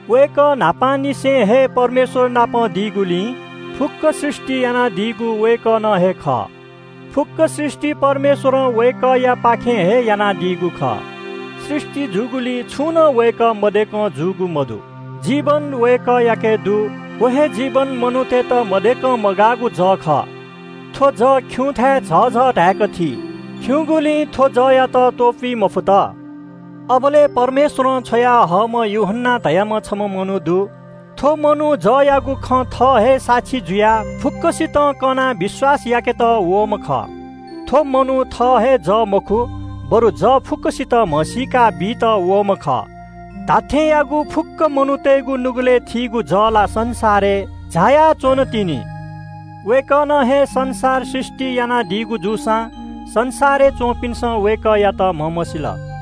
वय्‌कः न्‍हापांनिसें हे परमेश्‍वर नाप दी। फुक्‍कं सृष्‍टि यानादीगु वय्‌कलं हे खः। फुक्‍क सृष्‍टि परमेश्‍वरं वय्‌कःयापाखें हे यानादीगु खः। सृष्‍टि जूगुलिइ छुं नं वय्‌कः मदय्‌कं जूगु मदु। जीवन वय्‌कःयाके दु। व हे जीवन मनूतय्‌त मदय्‌कं मगाःगु जः खः। थ्‍व जः खिउँथाय् झःझः धाय्‌क थी, खिउँगुलिं थ्‍व जःयात त्‍वपुइ मफुत। अबलय् परमेश्‍वरं छ्वयाहःम्‍ह यूहन्‍ना धाःम्‍ह छम्‍ह मनू दु। थ्‍व मनू जःयागु खँ थः हे साक्षी जुयाः फुक्‍कसितं कनाः विश्‍वास याकेत वःम्‍ह खः। थ्‍व मनू थः हे जः मखु, बरु जः फुक्‍कसितं म्‍हसीका बीत वःम्‍ह खः। फुक्‍क मनूतय्‌गु नुगलय् थीगु धात्‍थेंयागु जः ला संसारय् झायाच्‍वंगु दु। वय्‌कः संसारय् दी, वय्‌कलं हे संसार सृष्‍टि यानादीगु जूसां संसारय् च्‍वंपिन्‍सं वय्‌कःयात म्‍हमसील।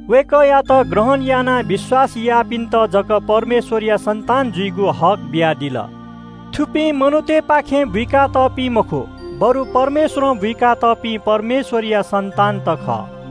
वय्‌कःयात ग्रहण यानाः विश्‍वास याःपिन्‍त धाःसा परमेश्‍वरया सन्‍तान जुइगु हक बियादिल। थुपिं मनूतय्‌पाखें बुइका तःपिं मखु, बरु परमेश्‍वरं बुइका तःपिं परमेश्‍वरया सन्‍तान खः।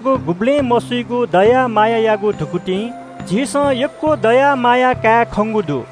वय्‌कःयागु गुबलें मसुइगु दया मायायागु धुकुतिं झीसं यक्‍व दया माया काये खंगु दु।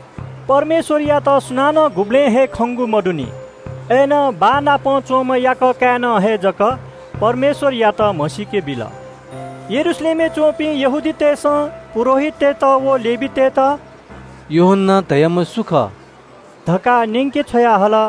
परमेश्‍वरयात सुनानं गुबलें हे खंगु मदु। अय्‌नं बाः नाप च्‍वंम्‍ह याकः काय्‌नं हे वय्‌कःयात क्‍यनादीगु दु। यरूशलेमय् च्‍वंपिं यहूदी नायःतय्‌सं पुजाहारी व लेवीतय्‌त “यूहन्‍ना धाःम्‍ह सु खः” धकाः न्‍यंके छ्वयाहल।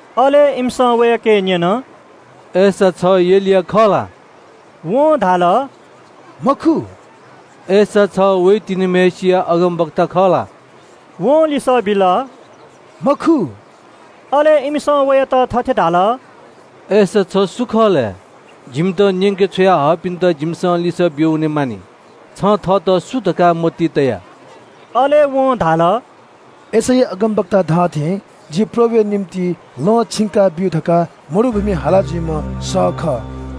अले इमिसं वयाके न्‍यन – “अय्‌सा छ एलिया खः ला?” वं धाल – “मखु।” “अय्‌सा छ व अगमवक्ता खः ला?” वं लिसः बिल – “मखु।” अले इमिसं वयात थथे धाल – “अय्‌सा छ सु खः लय्? जिमित न्‍यंके छ्वया हःपिन्‍त जिमिसं लिसः ब्‍यू वनेमानि। छं थःत सु धकाः मतिइ तया?” अले वं धाल – “यशैया अगमवक्तां धाःथें जि परमप्रभुया निंतिं लँ छिंकाब्‍यु धकाः मरुभूमिइ हाला जुइम्‍हय्‌सिया सः खः।”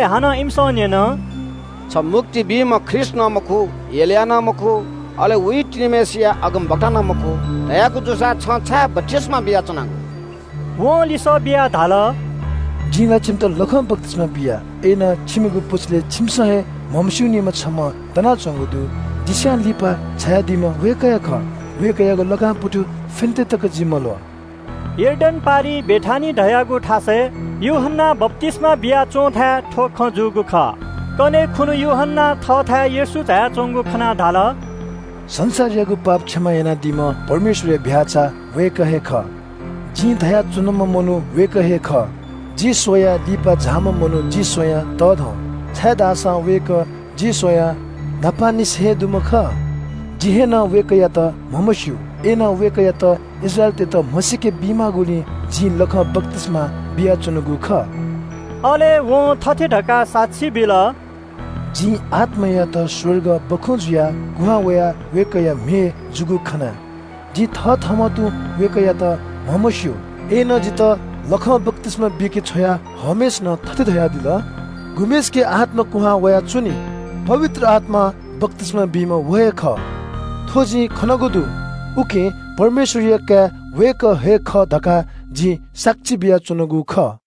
हानं न्‍यन – “छ मुक्ति बीम्‍ह ख्रीष्‍ट नं मखु, एलिया नं मखु, अले व अगमवक्ता नं मखु धयागु जूसा छं छाय् बप्‍तिस्‍मा बियाच्‍वनागु?” वं लिसः बियाः धाल – “जिं ला छिमित लखं बप्‍तिस्‍मा बिया, अय्‌नं छिमिगु पुचलय् छिमिसं हे म्‍हमस्‍यूनिम्‍ह छम्‍ह दनाच्‍वंगु दु। जि स्‍वयाः लिपा झायादीम्‍ह वय्‌कः हे खः। वय्‌कःयागु लाकां पुतु फ्‍यनेत तकं जि मल्‍वः।” यर्दन पारिइ बेथानिया धाःगु थासय् यूहन्‍नां बप्‍तिस्‍मा बिया च्‍वंथाय् थ्‍व खँ जूगु खः। कन्‍हय् खुन्‍हु यूहन्‍नां थःथाय् येशू झायाच्‍वंगु खनाः धाल – “संसारयागु पाप क्षमा यानादीम्‍ह परमेश्‍वरया चीधिकःम्‍ह भ्‍याःचा वय्‌कः हे खः। जिं धया च्‍वनाम्‍ह मनू वय्‌कः हे खः – ‘जि स्‍वयाः लिपा झाइम्‍ह मनू जि स्‍वयाः तःधं, छाय्‌धाःसा वय्‌कः जि स्‍वयाः न्‍हापांनिसें हे दुम्‍ह खः।’ जिं नं वय्‌कःयात म्‍हमस्‍यू, अय्‌नं वय्‌कःयात इस्राएलीतय्‌त म्‍हसीके बी माःगुलिं जिं लखं बप्‍तिस्‍मा बियाच्‍वनागु खः।” अले वं थथे धकाः साक्षी बिल – “जिं पवित्र आत्‍मायात स्‍वर्गं सुकुभतु थें कुहां वयाः वय्‌कःया म्‍हय् जूगु खना। जिं थथःम्‍हं तुं वय्‌कःयात म्‍हमस्‍यू, अय्‌नं जितः लखं बप्‍तिस्‍मा बीके छ्वया हःम्‍हय्‌सिनं थथे धयादिल – ‘गुम्‍हय्‌सिके आत्‍मा क्‍वहां वयाः च्‍वनी, पवित्र आत्‍मां बप्‍तिस्‍मा बीम्‍ह व हे खः।’ थ्‍व जिं खनागु दु, उकिं परमेश्‍वरया काय् वय्‌कः हे खः धकाः जिं साक्षी बियाच्‍वनागु खः।”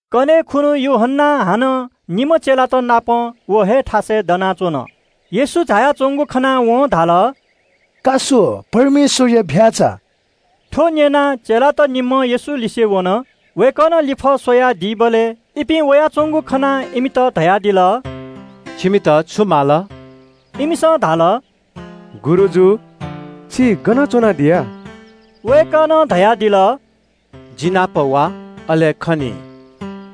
कन्‍हय् खुन्‍हु यूहन्‍ना हानं निम्‍ह चेलात नाप व हे थासय् दनाच्‍वन। येशू झायाच्‍वंगु खनाः वं धाल – “का स्‍व, परमेश्‍वरया चीधिकःम्‍ह भ्‍याःचा।” थ्‍व न्‍यनाः चेलात निम्‍हं येशूया ल्‍यूल्‍यू वन। वय्‌कलं लिफः स्‍वयादीबलय् इपिं वयाच्‍वंगु खनाः इमित धयादिल – “छिमिसं सुयात माला च्‍वनागु?” इमिसं धाल – “गुरुजु, छि गन च्‍वनादी?” वय्‌कलं धयादिल – “जि नाप वा, अले खनी।”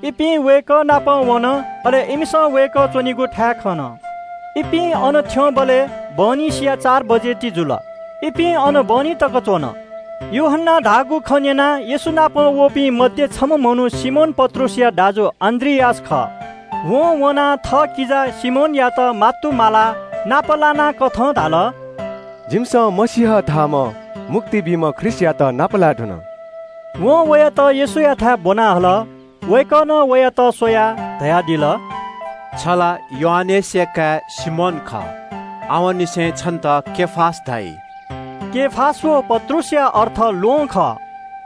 इपिं वय्‌कः नाप वन, अले इमिसं वय्‌कः च्‍वनीगु थाय् खन। इपिं अन थ्‍यंबलय् बहनिसिया प्‍यता ई जूगुलिं इपिं वय्‌कःनापं अन हे बाय् च्‍वन। यूहन्‍नां धाःगु खँ न्‍यनाः येशू नाप वंपिं मध्‍ये छम्‍ह मनू सिमोन पत्रुसया दाजु अन्‍द्रियास खः। वं वनाः थःकिजा सिमोनयात मात्तुमालाः नापलाना धाल – “जिमिसं मसीह धाःम्‍ह मुक्ति बीम्‍ह ख्रीष्‍टयात नापलाये धुन।” वं वयात येशूयाथाय् ब्‍वना हल। वय्‌कलं वयात स्‍वयाः धयादिल – “छ ला योआनेसया काय् सिमोन खः। आवंनिसें छन्‍त केफास धाइ।” केफास व पत्रुसया अर्थ “ल्‍वहं” खः।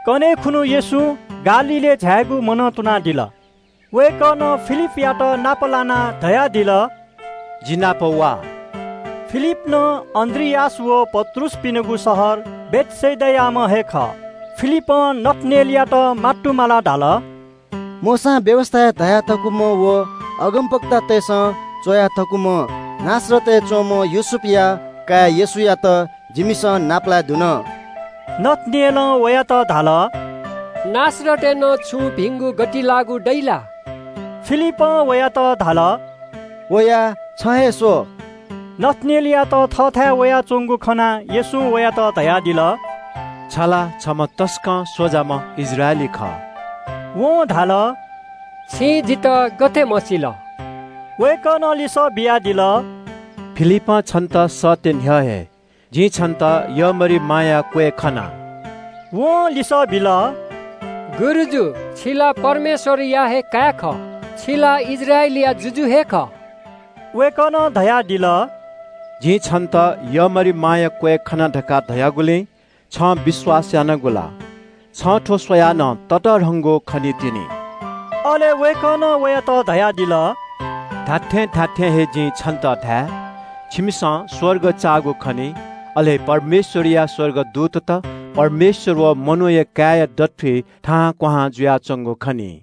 कन्‍हय् खुन्‍हु येशूं गालीलय् झायेगु मनं तुनादिल। वय्‌कलं फिलिपयात नाप लानाः धयादिल – “जि नाप वा।” फिलिप नं अन्‍द्रियास व पत्रुसपिनिगु शहर बेथसेदायाम्‍ह हे खः। फिलिपं नथानेलयात नाप लानाः धाल – “मोशां व्‍यवस्‍थाय् धया थकूम्‍ह व अगमवक्तातय्‌सं च्‍वया थकूम्‍ह नासरतय् च्‍वंम्‍ह योसेफया काय् येशूयात जिमिसं नापलाये धुन।” नथानेलं वयात धाल – “नासरतं नं छुं भिंगु गतिलाःगु खँ वइ ला?” फिलिपं वयात धाल – “वयाः छं हे स्‍व।” नथानेलयात थःथाय् वयाच्‍वंगु खनाः येशूं वयात धयादिल – “छ ला छम्‍ह तसकं स्‍वजाम्‍ह इस्राएली खः।” वं धाल – “छिं जितः गथे म्‍हसिल?” वय्‌कलं लिसः बियादिल – “फिलिपं छन्‍त सःते न्‍ह्यः हे जिं छन्‍त यःमरिमाया क्‍वय् खना।” वं लिसः बिल – “गुरुजु, छि ला परमेश्‍वरया हे काय् खः। छि ला इस्राएलया जुजु हे खः।” वय्‌कलं धयादिल – “जिं छन्‍त यःमरिमाया क्‍वय् खना धकाः धयागुलिं छं विश्‍वास यानागु ला? छं थ्‍व स्‍वयाः नं ततःधंगु खनीतिनि।” अले वय्‌कलं वयात धयादिल – “धात्‍थें धात्‍थें हे जिं छन्‍त धाये – छिमिसं स्‍वर्ग चाःगु खनी, अले परमेश्‍वरया स्‍वर्गदूतत परमेश्‍वर व मनूया काय्‌या दथुइ थाहां क्‍वहां जुयाच्‍वंगु खनी।”